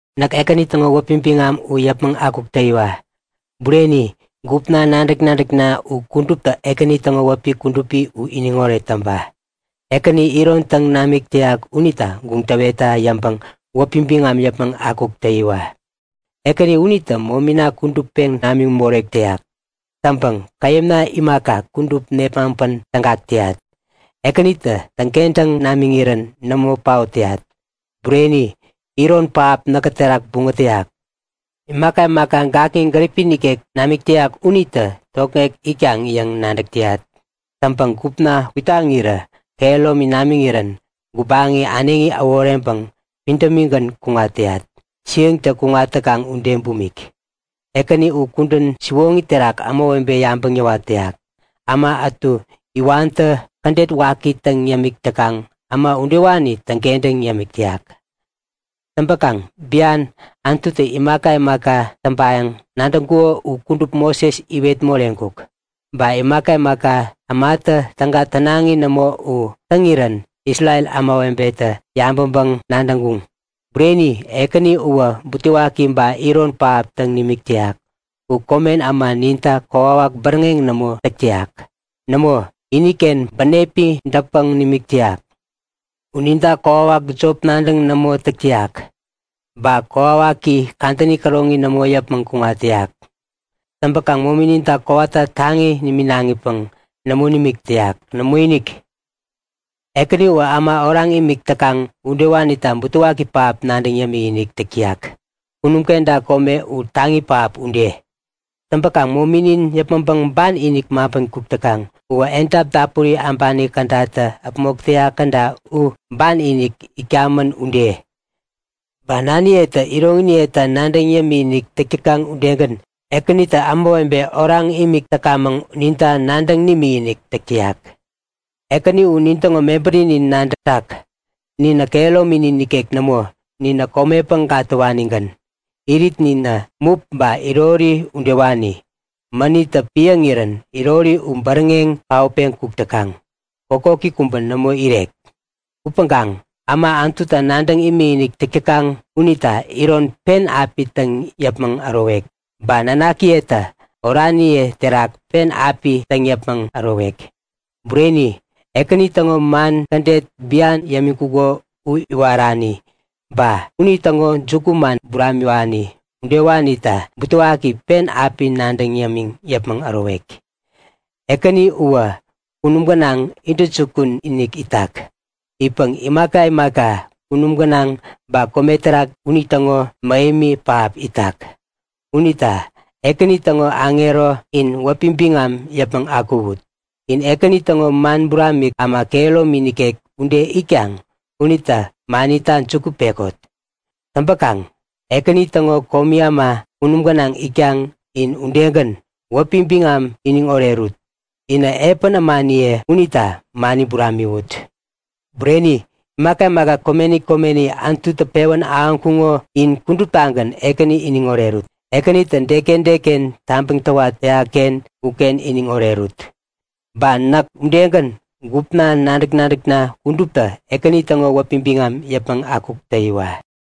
Näk Ekäni täŋo wäpi biŋam u yäpmäŋ akuk täyiwa! Bureni! Gupna, nadäk-nadäkna u kuduptä Ekäni täŋo wäpi kudupi u iniŋoret täŋpa! Ekänitä iron täŋ namik täyak unita guŋ täwetta yäŋpäŋ wäpi biŋam yäpmäŋ akuk täyiwa! Ekäni unitä momina kudup peŋ namiŋ morek täyak. Täŋpäŋ käyämna imaka, kudup nepmaŋpän tägak täyat. Ekänitä täŋkentäŋ namiŋirän nämo paot täyat. Bureni! Iron pähap näkä terak buŋät täyak. Imaka imaka gakŋi gäripi nikek namik täyak unitä tokŋek itkaŋ yäŋ nadäk täyat. Täŋpäŋ gupna kwitaŋirä kehäromi namiŋirän gubaŋi äneŋi äworeŋpäŋ pidämigän kuŋat täyat, siäŋtä kuŋat täkaŋ ude bumik. Ekäni u kudän siwoŋi terak ämawebe yabäŋ yäwat täyak. Äma ätu iwantä kädet waki täŋ yämik täkaŋ, äma udewani täŋkentäŋ yämik täyak. Täŋpäkaŋ bian, Anututä imaka imaka täŋpayäŋ nadäŋkuko u kudup Moses iwet moreŋkuk. Ba imaka imaka ämatä täga tänaŋi nämo u täŋirän Isrel ämawebetä yabäŋpäŋ-nadäŋkuŋ. Bureni! Ekäni uwä butewaki ba iron pähap täŋ nimik täyak. U komen äma ninta kokwawak bäräŋeŋ nämo täk täyak. Nämo, iniken bänepi dätpäŋ nimik täyak. U ninta kokwawak jop nadäŋ nämo täk täyak. Ba kokwawaki kadäni käroŋi nämo yäpmäŋ kuŋat täyak. Täŋpäkaŋ momininta ba wakiwakininta kowata taŋi niminaŋipäŋ nämo nimik täyak. Nämoinik! Ekäni uwä äma oraŋ imik täkaŋ udewanita butewaki pähap nadäŋ yämik-inik täk täyak, kunum kenta kome u taŋi pähap ude. Täŋpäkaŋ mominin yäpmäŋpäŋ ban-inik maŋpän kuk täkaŋ uwä edap dapuri äbani kädatä äpmok täyak käda u ban-inik itkamän ude. Ba naniyetä iroŋiniyeta nadäŋ yämik-inik täk täkaŋ udegän Ekänitä ämawebe oraŋ imik täkamäŋ, ninta nadäŋ nimikinik täk täyak. Ekäni u nintäŋo mebärinin nadätak. Ninä kehärominin nikek nämo, ninä komepäŋ gatäwanigän. Iritninä mup ba irori udewani. Mänittä piäŋirän irori u bäräŋeŋ paotpeŋ kuk täkaŋ. Kokoki kubä nämo irek. Upäŋkaŋ äma Anututa nadäŋ imikinik täk täkaŋ unita iron pen api täŋ yämiŋ yäpmäŋ ärowek. Ba nanakiyetä oraniye terak pen api täŋ yäpmäŋ ärowek. Bureni, Ekäni täŋo man kädet bian yämiŋkuko u iwarani, ba unitäŋo jukuman buramiwani udewanita butewaki pen api nadäŋ yämiŋ yäpmäŋ ärowek. Ekäni uwä kunum gänaŋ intäjukun-inik itak. Itpäŋ imaka imaka kunum gänaŋ ba kome terak unitäŋo mähemi pähap itak. Unita Ekäni täŋo aŋero, in wäpi biŋam yäpmäŋ akuwut! In Ekäni täŋo man buramik äma kehäromi nikek ude itkaŋ unita manita juku pekot! Täŋpäkaŋ Ekäni täŋo komi äma kunum gänaŋ itkaŋ, in udegän, wäpi biŋam iniŋ orerut. Inä epän ämaniye unita mani buramiwut! Bureni! Imaka imaka komeni komeni Anututä pewän ahäŋkuŋo in kuduptagän Ekäni iniŋ orerut. Ekänitä deken deken tabäŋ täwat täyakken uken iniŋ orerut. Ba näk udegän, gupna, nadäk-nadäkna kuduptä Ekäni täŋo wäpi biŋam yäpmäŋ akuk täyiwa!